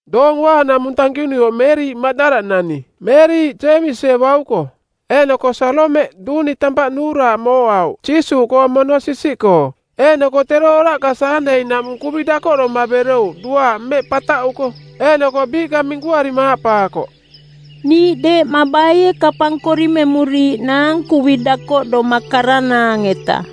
Doong Uaanaꞌmung tankinuioꞌ Meeriꞌ Maꞌdala-nani, Meeriꞌ Jeemisie bauko, eeꞌnoko Saalomeꞌ duuni tampaꞌ nuuraaꞌ mooꞌauꞌ Jiisuuꞌkoong mono sisiꞌkoo. Eeꞌnoko tero oraꞌka Saandei-naꞌmung kuvi dakoꞌdoma berouꞌ duaaꞌ mmeꞌ pataꞌuko. Eeꞌnoko biiꞌka minkuarima aaꞌpaakoꞌ, “Niiꞌ deeꞌma baie kapang korimemuriiꞌnaang kuvi dakoꞌdoma karanaang-eta?”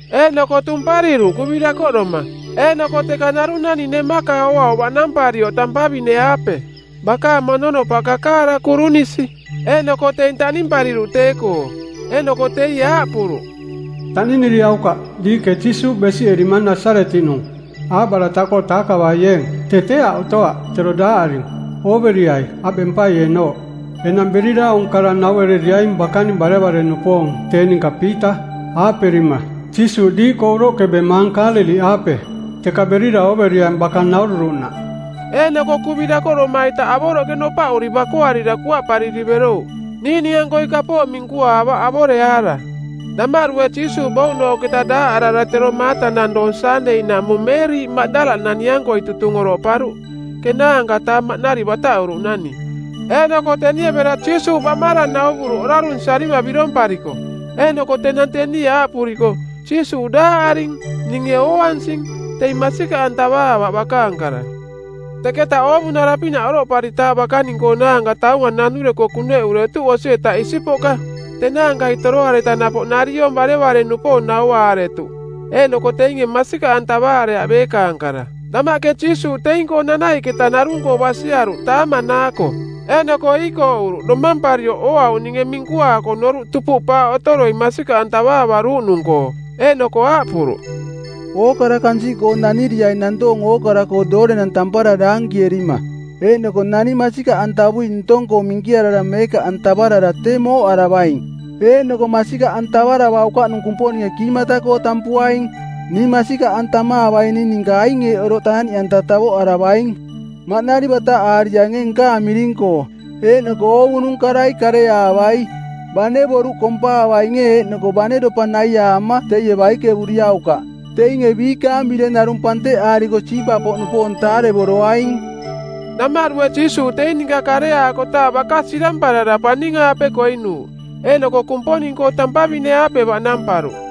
Eeꞌnoko tumpariruꞌ kuvi dakoꞌdoma. Eeꞌnoko teka narung naning nemaka ooauꞌ baꞌnamparioꞌ tampavine-aape. Bakaang mononopaꞌ kakaara kurunisi. Eeꞌnoko teing taꞌnimpariruꞌ tee-koo. Eeꞌnoko teie aaꞌpuruꞌ, “Taꞌniniriaukaꞌ. Diiꞌke Jiisuuꞌ besiꞌerimang Nasaretiꞌnung aaꞌbarataꞌkoo taakavaieeng. Tee tee aꞌ otoaꞌ, tero daaꞌaring. Ooveriai aꞌ bempaieenooꞌ. Enang berira aung kara nauereriaing bakaning barevare-nupoong tee ninka Piita, aaꞌperima, ‘Jiisuuꞌ diiꞌkoo uroꞌke bemaang Kaaleliꞌaape. Teka berira ooveriaing baka naururuꞌnaꞌ.’” Eeꞌnoko kuvi dakoꞌdoma-ita avoroꞌke nopaꞌuri bakoarira kuaꞌpariri berouꞌ. Niiꞌning-ankoi kapooꞌ minkuaavaꞌ avoreaara. Damaꞌdue Jiisuuꞌ bouꞌnooꞌketa daaꞌarara tero maatanang doong Saandei-naꞌmung Meeriꞌ Maꞌdalanani-ankoi tutung oroꞌparuꞌ ˜kenaanka-taa maꞌnari bataꞌuruꞌnani. Eeꞌnoko tenie bera Jiisuuꞌ baꞌmarang nauvuruꞌ orarunsiarima birompariko. Eeꞌnoko tenang tenie aaꞌpuriko, “Jiisuuꞌ daaꞌaring, ninge ooansing,” teing masikaꞌantavaavaꞌ bakaang kara. Teketa oovunara-pinaꞌ oroꞌparitaaꞌ bakaning-koonaanka taunga nanureko kuneꞌuretuꞌ osi-eta isipoꞌka. Tenaankai toroareta napoꞌ nariong barevare-nupoong nauaaretuꞌ, eeꞌnoko teinge masikaꞌantavaareaꞌ beekaang kara. Damaꞌke Jiisuuꞌ teing-koo nanaiꞌketa narung-koo basiaruꞌ taamanaako. Eeꞌnoko iikooꞌuruꞌ domamparioꞌ ooauꞌninge minkuaako noruꞌ tupuꞌpaaꞌ otoroi masikaꞌantavaariaruuꞌnung-koo. Eeꞌnoko aaꞌpuruꞌ, “Ookara kansiꞌkoo naniriaing nantoong ookara-koo doorenang tampara daankierima. Eeꞌnoko naning masikaꞌantavui ntong-koo minkiarara meekaꞌantavarara tee mooꞌaravaing, eeꞌnoko masikaꞌantavuaukaꞌnung Kumponinge kiimata-koo tampuaing. Ning masikaꞌantamaavaining ninka aing eeꞌ oroꞌ taaꞌniꞌanta tavoꞌaravaing: Maꞌnari bataꞌaariainge nkaang miring-koo, eeꞌnoko oovunung karai kareaavai. Bane boruꞌ kompaavainge eeꞌnoko bane dopa naiaama teie baikevuriaukaꞌ. Teinge biikaang bireng narung panteꞌaariko siipa-poꞌnupoong taarevoroaing.” Damaꞌdue Jiisuuꞌ teing ninka kareaakotaaꞌ baka siramparara paning-aape koinuuꞌ, eeꞌnoko Kumponing-koo tampavine-aape baꞌnamparuꞌ.